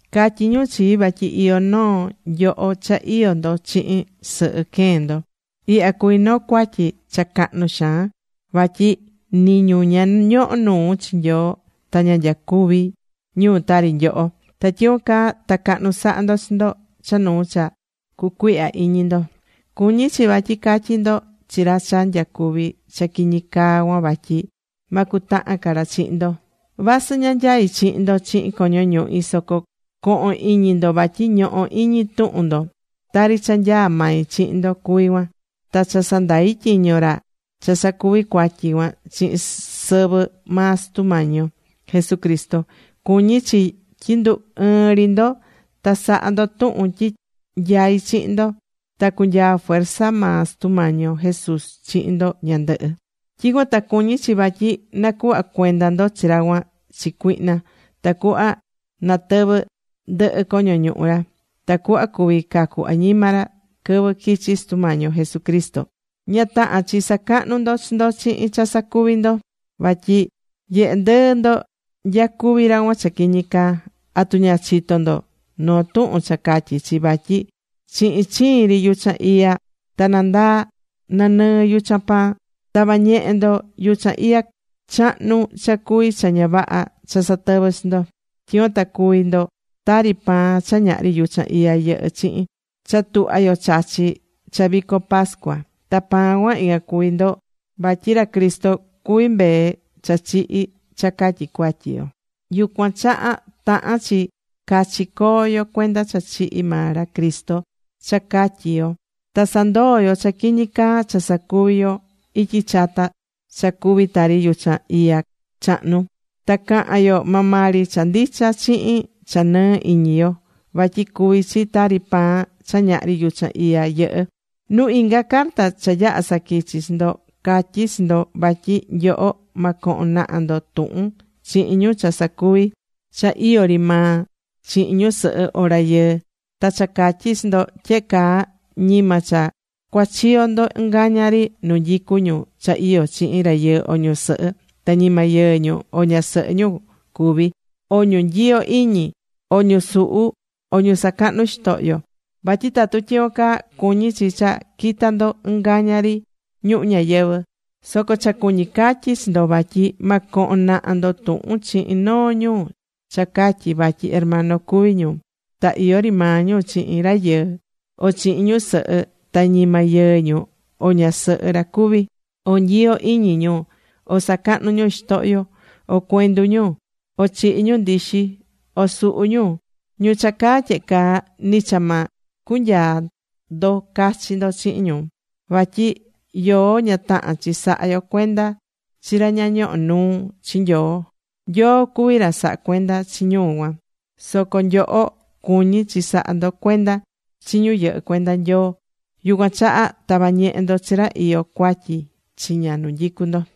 Catyí ñu chii vatyi iyó noo nyoho cha iyó ndo chihin sɨhɨ queen ndo. Ihya cuví noo cuatyi cha cahnu xaan, vatyi nɨ ñu ña ñohó nuu chi Nyoo ta ña nyacuví ñu tari nyoho. ¡Ta tyicuan caa ta cahnu sahá ndo chi ndo cha nuu cha cucuihyá iñi ndo! Cuñí chi vatyi ca̱tyi ndo chi ra cha nyacuví cha quiñi caa cuan vatyi ma cutahan ca ra chihin ndo. Vasɨ ña nyaí chihin ndo chihin coño ñuhi, soco co̱hon iñi ndo vatyi ñohó iñi tuhun ndo, tari cha nyaá mai chihin ndo cuví cuan. Ta cha sandai̱ tyiño ra cha sacuvi̱ cuatyi cuan chihin sɨvɨ maa Sutu Mañi yo Jesucristo. Cuñí chi tyi ndu ɨɨn ri ndo. Ta sa̱ha ndo tuhun tyi nyaí chihin ndo. Ta cunyaa fuerza maa Sutu Mañi yo Jesús chihin ndo ñandɨhɨ. Tyicuan ta cuñí chi vatyi nacuhva cuenda ndo chi ra cuan chi cuihna, tacuhva natɨvɨ ndɨhɨ coño ñuhu ra. Ta cuhva cuví cacu añima ra quɨvɨ quichi Sutu Mañi yo Jesucristo. Ña tahán chi sacahnu ndo chi ndo chihin cha sacuví ndo. Vatyi nyehé ndɨɨ ndo nyacuví ra cuan cha quiñi caa. ¿Atu ña chitó ndo noo tuhun cha catyí chi vatyi chihin chiin ri yuchan iya ta nandaa nanɨɨ yuchan pan? Ta̱va ñehe ndo yuchan iya chahnu cha cuví cha ña vaha cha satɨvɨ́ chi ndo. Tyicuan ta cuvi ndo tari pan cha ñahri yuchan iya yɨhɨ́ chihin, cha tuhva yo chachí cha vico pascua. Ta pan cuan, ican cuví ndo vatyi ra Cristo cuví mbee cha chihi cha catyi cuatyi yo. Yucuan chaha tahán chi cachi coo yo cuenda cha chihi̱ maa ra Cristo cha catyi yo. Ta sandoó yo cha quiñi caa cha sacuvi̱ yo ityi chata cha cuví tari yuchan iya chahnu. Ta cahán yo maa maa ri cha ndicha chihin cha nɨɨ iñi yo. Vatyi cuví chi tari pan cha ñahri yuchan iya yɨhɨ́. Nuu inga carta cha yaha̱ saquichi chi ndo, catyi̱ chi ndo vatyi nyoho ma cohon naha ndo tuhun chihin ñu cha sacuví cha iyó ri maa chihin ñusɨhɨ o rayɨɨ. Ta cha catyi̱ chi ndo tyehe caa, ñima cha cuachiyo ndo ɨngaña ri nu nyicú ñu cha iyó chihin rayɨɨ o ñusɨhɨ, ta ñima yɨɨ ñu o ñasɨhɨ ra cuví, o ñu nyiyó iñi, o ñu suhú, o ñu sacahnú xitohyo. Vatyi tatu tyicuan caa, cuñí chi cha quita ndo ɨngaña ri ñuhu ñayɨvɨ̱. Soco cha cuñí catyí chi ndo vatyi ma cohon naha ndo tuhun chihin noo ñu cha catyí vatyi hermano cuví ñu, ta iyó ri maa ñu chihin rayɨɨ o chihin ñusɨhɨ ta ñima yɨɨ ñu o ñasɨhɨ ra cuví, o nyiyó iñi ñu, o sacahnú ñu xitohyo, o cuendu ñu, o chihí ñu ndixi, o suhú ñu. Ñu cha caá tyehe caa, ni cha ma cunyaa ndo cachi ndo chihin ñu. Vatyi yoó ña tahán chi sahá yo cuenda chi ra ña ñohó nuu chi Nyoo. Nyoo cuvi ra sahá cuenda chi ñu cuan. Soco nyoho cuñí chi sahá ndo cuenda chi ñu yɨhɨ́ cuenda Nyoo. Yucuan chaha tavá ñehe ndo chi ra iyó cuatyi chiña nu nyicu ndo.